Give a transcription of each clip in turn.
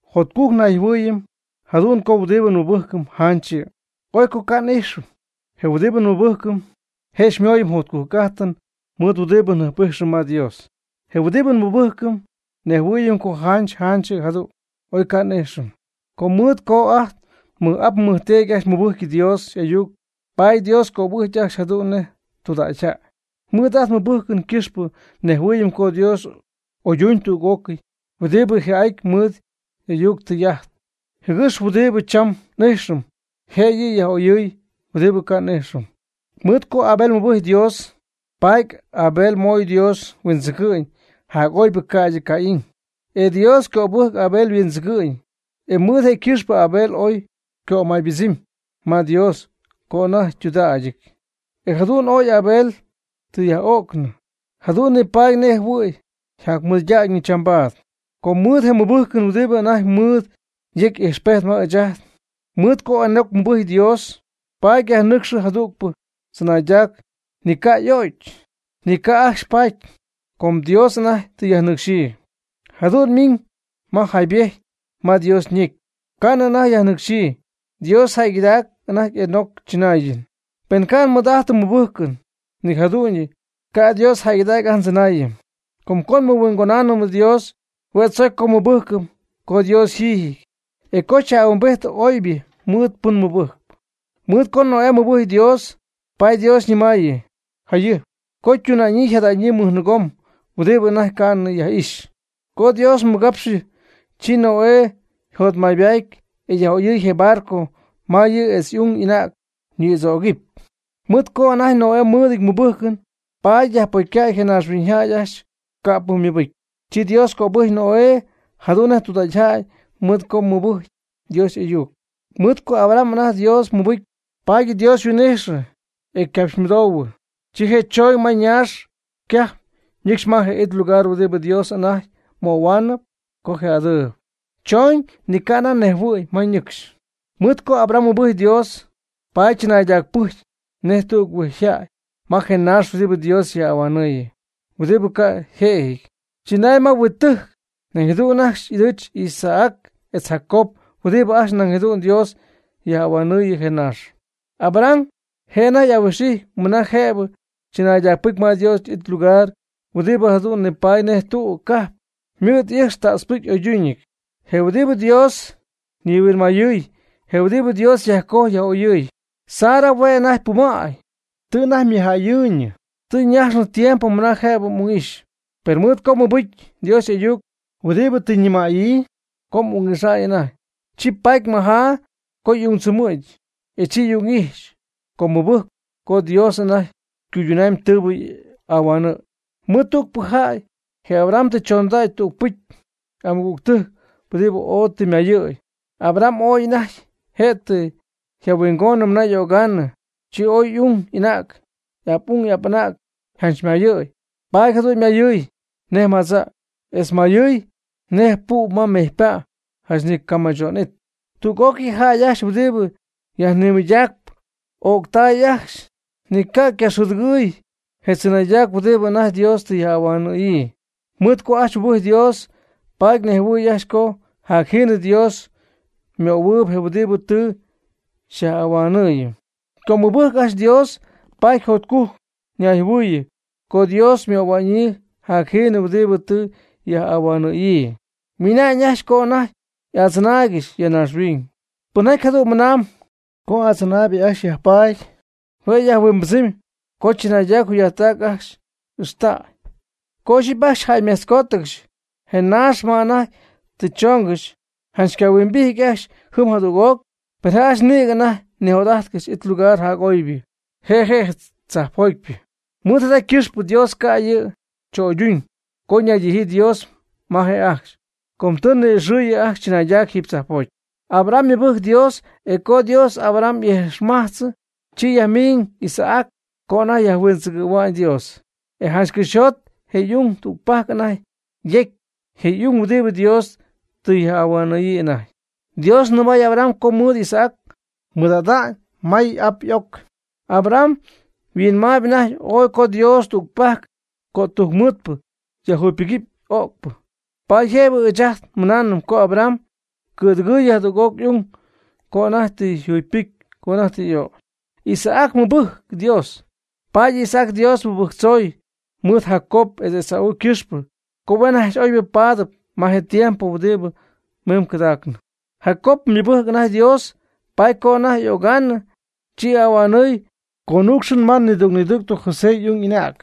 Jotcujc nayjɨhuɨɨyɨm jadu'n co huɨdibɨ nmɨbɨjcɨm janch yɨ', oy co ca' n'ijxɨm. Je huɨdibɨ nmɨbɨjcɨm je' xymooyɨm jotcujc'ajtɨn mɨɨd huɨdibɨ njɨjp'ijxɨm ma Dios. Je huɨdibɨ nmɨbɨjcɨm nejhuɨɨyɨm co janch janch jadu'n, oy ca' n'ijxɨm. Com mɨɨd co ajt nmɨj'ap nmɨjteedy ajcxy mɨbɨjcɨ Dios y'ayuc paady Dios cöbɨjcy ajcxy jadu'n nej tudägyjäy. Mɨɨd ajt nmɨbɨjcɨn ycɨxpɨ nejhuɨɨyɨm co Dios oyduñ tüg'ócɨy huɨdibɨ jii'ajtp mɨɨd y'ayuctɨ'ajty, jɨgɨx huɨdibɨ cham n'ijxɨm je' yɨ' yaj'oyɨɨy huɨdibɨ ca' yaj'ixy. Mɨɨd co Abel mɨbɨjcy Dios, paady Abel ymoy Dios huindzɨgɨ'ñ jac'oybɨ ca'ydɨ Caín, e Dios cöbɨjcɨ Abel yhuindzɨgɨ'ñ, e mɨɨd je' ycɨxpɨ Abel ooy ycömaybɨdzɨmy ma Dios co anajty ytudägyɨty. E jadu'n oy Abel tɨ yja'o'cɨnɨ, jadu'n nipaady nej jɨhuɨ̈y yjacmɨydägyñɨ chambaad. Com mɨɨd je mɨbɨjcɨn huɨdibɨ anajty ymɨɨd yejc ijxpejt ma ɨɨch ajt. Mɨɨd co Enoc mɨbɨjcy Dios paady yajnɨcxɨ jadügpɨ tzɨnaydac ni yca'o'cy, ni ca' ajcxy paty, com Dios anajty tɨ yajnɨcxyii. Jadu'n ymɨna'ñ ma yjaybetyɨty ma Dios ñecy, ca'nɨ anajty yajnɨcxyii: “Dios jäygɨdacpy anajty Enoc chɨnaayɨn.” Pen ca' nmɨɨd'ajtɨm mɨbɨjcɨn ni jadu'ñyɨ, ca' Dios jäygɨdägy ajt ndzɨnaayɨn. Com co nmɨhuingonaanɨm Dios, hue' tzocy co nmɨbɨjcɨm co Dios yjiijɨty, e co yaj'ahuimbidɨpy oybɨ mɨɨd pɨn mɨbɨjcɨp. Mɨɨd co Noé mɨbɨjcy Dios, paady Dios ñɨmaayɨ jayɨjp co ytuna'ñyii yjada'ñyii mɨjnɨɨgom huɨdibɨ anajty ca'nɨ yaj'ixy. Co Dios ymɨgapxɨ, chi Noé yjotmaybaady e yaj'oyɨy je barco ma yɨ' etz y'ung y'anäg ñɨɨgomdzögɨpy. Mɨɨd co anajty Noé mɨɨdɨty mɨbɨjcɨn, paady yajpocycäy je naaxhuiñyjäy ajcxy ca'pɨ ymɨbɨcy. Chi Dios cöbɨjcy Noé jadu'n nej tudägyjäy mɨɨd co mɨbɨjcɨ Dios y'ayuc. Mɨɨd co Abraham anajty Dios mɨbɨcy, paady Dios yhuin'ijxɨ e ycapxymɨdouhuɨ. Chi je' chooñ ma ñaax ycajpɨn ñɨcxy ma je it lugar huɨdibɨ Dios anajty möhuaanɨp co je'adɨɨyb. Choñ, ni ca' anajty nejhuɨ̈y ma ñɨcxy. Mɨɨd co Abraham mɨbɨjcy Dios, paady chɨnaydacpɨjcy nej tüg huingjäy ma je naax huɨdibɨ Dios yaj'ahuanɨɨyɨ, huɨdibɨ ca' yjëjɨty. Chɨnay ma huittɨjc, nañ jadu'n ajcxy y'ɨdɨɨch Isaac etz Jacob huɨdibɨ ajcxy nañ jadu'n Dios yaj'ahuanɨɨyɨ je naax. Abraham je' anajty y'ahuijxyp mɨna jëbɨ chɨnaydacpɨcy ma Dios y'it ylugar huɨdibɨ jadu'n nipatp nej tüg cajp huɨdibɨ mɨɨd y'ɨjx ta'tzpɨcy y'oyduñɨty, je huɨdibɨ Dios ñihuinmayɨɨy, je huɨdibɨ Dios yajcojy yaj'oyɨɨyb. Sara hue' anajty pumäy, tɨ anajty ymɨjäyɨɨyñɨ, tɨ ñajxnɨ tiempo mɨna jëbɨ y'ung'ixy. Per mɨɨd co mɨbɨjcy Dios y'ayuc huɨdibɨ tɨ ñɨmaayɨ co y'ung'ixa'ñ anajty, chi paty mɨjaa co y'ungdzɨmɨ̈gɨp. E chi y'ung'ijxy com ymɨbɨjc co Dios anajty cuyduna'ñ tɨɨbɨ ahuanɨ̈y. Mɨɨd tügpɨ jäy, je Abraham, tɨ choondacy tügpɨcy y'amɨgügtɨjc huɨdibɨ oy tɨ ymayɨ̈y. Abraham, oy anajty je' tɨ yjahuingonɨ mɨna y'ögaanɨ, chi ooy y'ung y'anäg, y'ap'ung y'apmang janchmay paty, jadu'n ymayɨty nej madza' etz ymayɨty nej pu' ma mejypa', janch ni ycamɨcho'nɨty. Tüg'ócɨy je jäy ajcxy huɨdibɨ ya yajnimɨydacp, öctay ajcxy ni ycacɨ̈dɨgɨɨyɨ je tzɨnaydac huɨdibɨ anajty Dios tɨ yaj'ahuanɨ̈yii. Mɨɨd co ajcxy mɨbɨjcy Dios, paady nejhuɨɨy ajcxy co jacjiinɨ Dios ymöhuɨɨyb je huɨdibɨ tɨ yaj'ahuanɨ̈yii. Com ymɨbɨjc ajcxy Dios, paady jotcujc ñayjɨhuɨɨyɨ co Dios möhua'ñyii jacjiinɨ huɨdibɨ tɨ yaj'ahuanɨ̈yii. Ymɨnañ ajcxy co anajty y'adzɨnaaygɨxy ya naaxhuiñ. Pɨnjaty jadu'n mɨnamb co adzɨnaaybɨ ajcxy yajpaady, hue' yajhuimbɨdzɨmy co chɨnaydac yjugy'ajttac ajcxy y'ixtaayb. Co ixyipy ajcxy jäymejtzó'cɨgɨxy je naax ma anajty tɨ choongɨxy, janch ycahuimbijty ajcxy jɨm jadüg'oc. Per je' ajcxy nïgɨ anajty nijot'ajtcɨxy it lugar jac'oybɨ, je' je' je tzajpjotypɨ. Mɨɨd jada ycɨxpɨ Dios ca' yɨ' cho'yduñ co ñaydijyii Dios ma je' ajcxy. Com tɨ ni'ixɨɨyɨ ajcxy chɨnaydac jiiby tzajpjoty. Abraham mɨbɨjcy Dios, e co Dios Abraham y'ijxmajtzɨ, chi yajmiiñ Isaac co anajty yajhuindzɨgɨ̈hua'ñ Dios. E janch cɨxyjot je y'ung tügpajc anajty yecy, je y'ung huɨdibɨ Dios tɨ yaj'ahuanɨ̈yii anajty. Dios ñɨmay Abraham co mɨɨd Isaac mɨɨd'ada'ñ may y'ap y'oc. Abraham yhuinmaayb anajty ooy co Dios tügpajc cötujcmɨɨdɨp yajjugypɨgɨpy öcpyɨ. Paady jëbɨ ɨɨch ajt nmɨnaanɨm co Abraham ycɨ̈dɨgɨɨyɨ jadüg'oc y'ung co anajty tɨ yjugypɨcy co anajty tɨ y'ögy. Isaac mɨbɨjcy Dios, paady Isaac Dios mɨbɨjctzoy mɨɨd Jacob etz Esau ycɨxpɨ co huen ajcxy oybɨ paadɨp ma je tiempo huɨdibɨ mim cɨdacnɨ. Jacob ymɨbɨjcy anajty Dios, paady co anajty y'ögaanɨ, chi ahuanɨɨy conuucxɨn ma nidüg nidüg José y'ung y'anäg.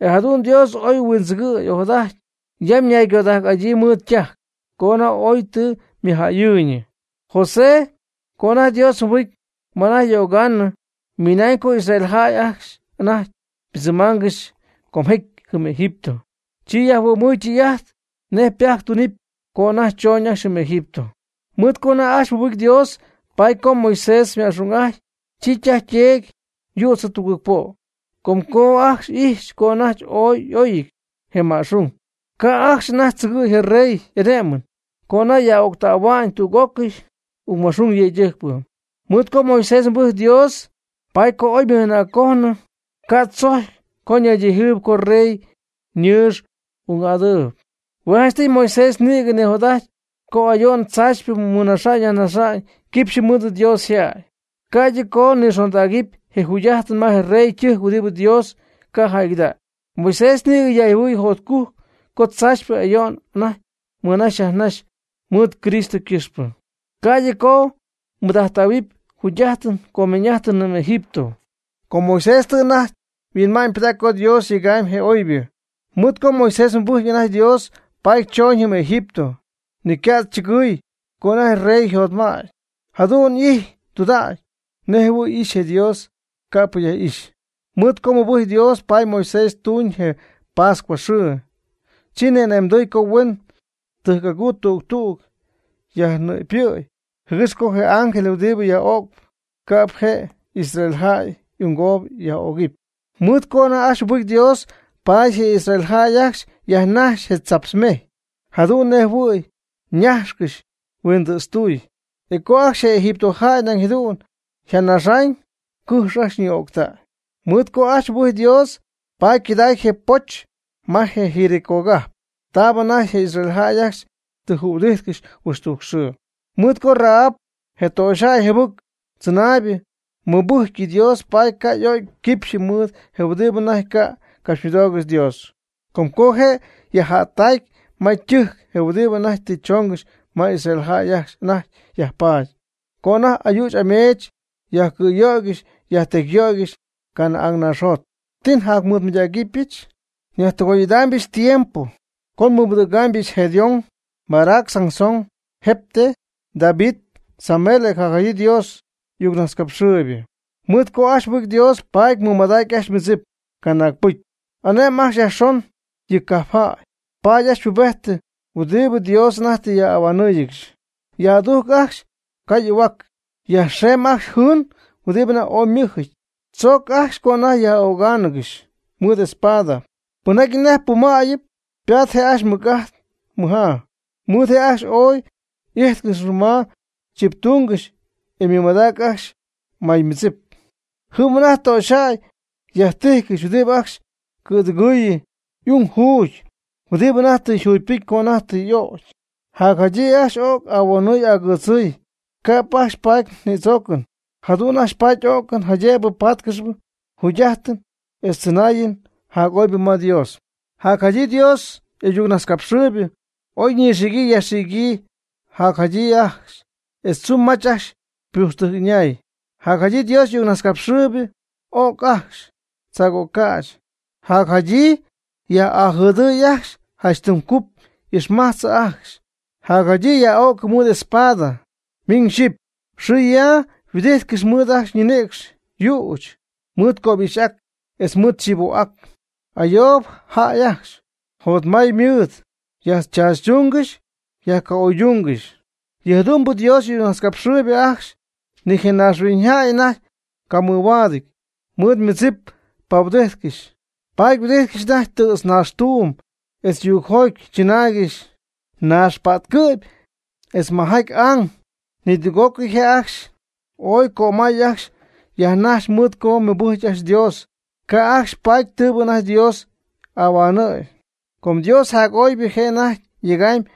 E jadu'n Dios ooy huindzɨgɨɨy ojadajty yam ñaygodajc'adyii mɨɨd ytajc co anajty ooy tɨ ymɨjjäyɨɨyñɨ. José co anajty Dios mɨbɨcy ma anajty y'ögaanɨ, ymɨnañ co Israel jäy ajcxy anajty ypɨdzɨmaangɨxy comjecy jɨm Egipto, chi yajhuɨ'my tɨy'ajt nej ypajc ytunɨɨyb co anajty choñ ajcxy jɨm Egipto. Mɨɨd co anajty ajcxy mɨbɨcy Dios, paady co Moisés yma'xung'ajty, chi ytaj yteedy yützɨ tugɨɨg po'. Com co ajcxy ijxy co anajty ooy y'oyɨty je ma'xung, ca' ajcxy anajty tzɨgɨ̈y je rey y'ane'mɨn co anajty yaj'öctähua'ñ tüg'ócɨy ungma'xung yëydɨjcpɨ. Mɨɨd co Moisés mɨbɨjcy Dios, paady co oy ymɨj'anäccojnɨ, ca' tzojcy co ñaydijɨɨyb co rey ñɨɨx y'ung'adɨɨb. Hue' janchtɨy Moisés nïgɨ nijot'ajty co ayo'n tzaachypɨ mɨnaxɨpy yajnaxɨpy quipxy mɨɨd Dios yjäy, ca'ydɨ co nixondägɨpy je jugy'ajtɨn ma je rey ytɨjc huɨdibɨ Dios ca' jäygɨdägy. Moisés nïgɨ ñayjɨhuɨɨyɨ jotcujc co tzaachypɨ ayo'n anajty mɨnaxy yajnaxy mɨɨd Cristo ycɨxpɨ, ca'ydɨ co mɨɨd'ajttähuɨpy jugy'ajt comeeñ'ajt jɨm Egipto. Com Moisés tɨ anajty yhuinma'ñypɨdägy co Dios yega'ñ je oybɨ. Mɨɨd co Moisés mɨbɨcy anajty Dios paady choñ jɨm Egipto, ni catzɨgɨy co anajty rey yjotmädy, jadu'n y'ijty tudägy nej jɨhuɨ̈y ixy je Dios ca'pɨ yaj'ixy. Mɨɨd co mɨbɨjcy Dios paady Moisés tuuñ je pascuaxɨɨ, chi ni'ane'mdɨɨy co huen tɨjc'aguu tüg tüg yajnɨ'pyɨ̈y, jɨgɨx co je ángel huɨdibɨ yaj'öcp, ca'p je' je israelitajäy y'ungoob yaj'o'cɨpy. Mɨɨd co ajcxy mɨbɨjcy Dios paady je israelitas ajcxy yajnajxy je tzaptz mejy jadu'n nej jɨhuɨ̈y ñajxcɨxy huindɨ̈tztuuy, e co ajcxy je Egipto jäy nañ jadu'n yjanaxañ, cɨjx ajcxy ñɨɨ'o'ctäy. Mɨɨd co ajcxy mɨbɨjcy Dios, paady ycɨdäday je poch ma je Jericógajp, taab anajty je israelitas ajcxy tɨ jühuɨdijtcɨxy huixtujc xɨɨ. Mɨɨd co Rahab, je töxyjäy jɨbɨc tzɨnaaybɨ, mɨbɨjcy Dios, paady ca' y'o'cy quipxyɨ mɨɨd je huɨdibɨ anajty ca' capxymɨdoogɨxy Dios. Com co je' yajjättacy ma ytɨjcɨn je huɨdibɨ anajty tɨ choongɨxy ma Israel jäy ajcxy anajty yajpaady, co anajty ayüch ameech yajcɨ̈yöygɨxy yajtecyyöygɨxy Canaán naaxjot. ¿Ti njacmɨydägɨbɨch? Nyajtɨgoy'idaamybɨch tiempo co nimɨydägɨbɨch Gedeón, Barac, Sansón, Jefté, David, Samuel, e jacjadyii Dios y'ayucnajtzcapxɨɨybɨ. Mɨɨd co ajcxy mɨbɨjcy Dios, paady ymɨmadac ajcxy ymɨdzip canaag pɨcy, ane'my ajcxy yajxon yɨ cajpjäy, ypaat ajcxy pubejtɨn huɨdibɨ Dios anajty tɨ yaj'ahuanɨ́ɨyɨgɨxy. Yaj'adujc ajcxy caa y'ahuac, yajxeem ajcxy jɨɨn huɨdi anajty ooy ymɨjɨty, tzooc ajcxy co anajty yaj'ögaangɨxy mɨɨd espada. Pɨnjaty anajty pumäyɨp ypaat je' ajcxy ymɨc'ajt ymɨjaa, mɨj je' ajcxy ooy y'íjtcɨxnɨ ma chiptungɨxy, e ymɨmadactay ajcxy maymɨdzip. Jɨm anajty töxyjäy yjájtɨgɨxy huɨdibɨ ajcxy cɨ̈dɨgɨɨyɨ y'ung juugy huɨdibɨ anajty tɨ jugypɨcy co anajty tɨ y'ögy. Jadyii ajcxy y'o'cy ahuonɨ' agɨdzɨ', ca'p ajcxy paty nïdzoocɨn. Jadu'n ajcxy paty o'cɨn, jaydëbɨ patcɨxy jugy'ajtɨn etz tzɨnaayɨm jac'oybɨ ma Dios. Jadyii Dios y'ayucnajtzcapxɨɨybɨ ooy ñɨxiicɨ yajxiicɨ, yajcɨ̈'ajty, etz tzumy mach ypujxtɨjc'ɨñäy. Jadyii Dios y'ayucnajtzcapxɨɨybɨ y'o'cy ajcxy tzaagögäch, jadyii yaj'ajɨdɨɨy ajcxy janch tɨm cup y'ijxmajtzɨ ajcxy, jadyii yaj'o'cɨ mɨɨd espada. Ymiñ xyɨjpy xɨɨ yaa yhuɨdijtcɨxy ymɨɨd ajcxy ñinïcx yüch mɨɨd cöbixy'ac etz mɨɨd chivo'ac, ayoob jäy ajcxy, jotmay mɨɨd, yajtzaachytungɨxy yajca'oydungɨxy. Yɨ jadu'mbɨ Dios y'ayucnajtzcapxɨɨybɨ ajcxy ni je naaxhuiñyjäy anajty camɨhuaadɨty. Mɨɨd ymɨdzip pahuɨdijtcɨxy, paady yhuɨdijtcɨxy anajty tɨ̈tznaaxtuum etz yuugjoty, chɨnaaygɨxy naaxpa'tcɨ'py etz majaty ang. Nidüg'ócɨy je' ajcxy oy cömay ajcxy yjanajxy mɨɨd co mɨbɨjcy ajcxy Dios, ca' ajcxy paty tɨɨbɨ anajty Dios y'ahuanɨ̈y. Com Dios jac'oybɨ je' anajty yegamyb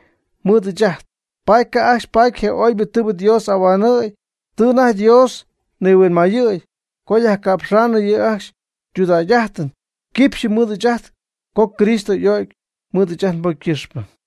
mɨɨd ɨɨch ajt, paady ca' ajcxy paty je oybɨ tɨɨbɨ Dios y'ahuanɨ̈y. Tɨ anajty Dios nihuinmayɨ̈y co yajca'pxaanɨ yɨ' ajcxy ytudägy'ajtɨn quipxyɨ mɨɨd ɨɨch ajt co Cristo y'o'cy mɨɨd ɨɨch ajt nbocy ycɨxpɨ.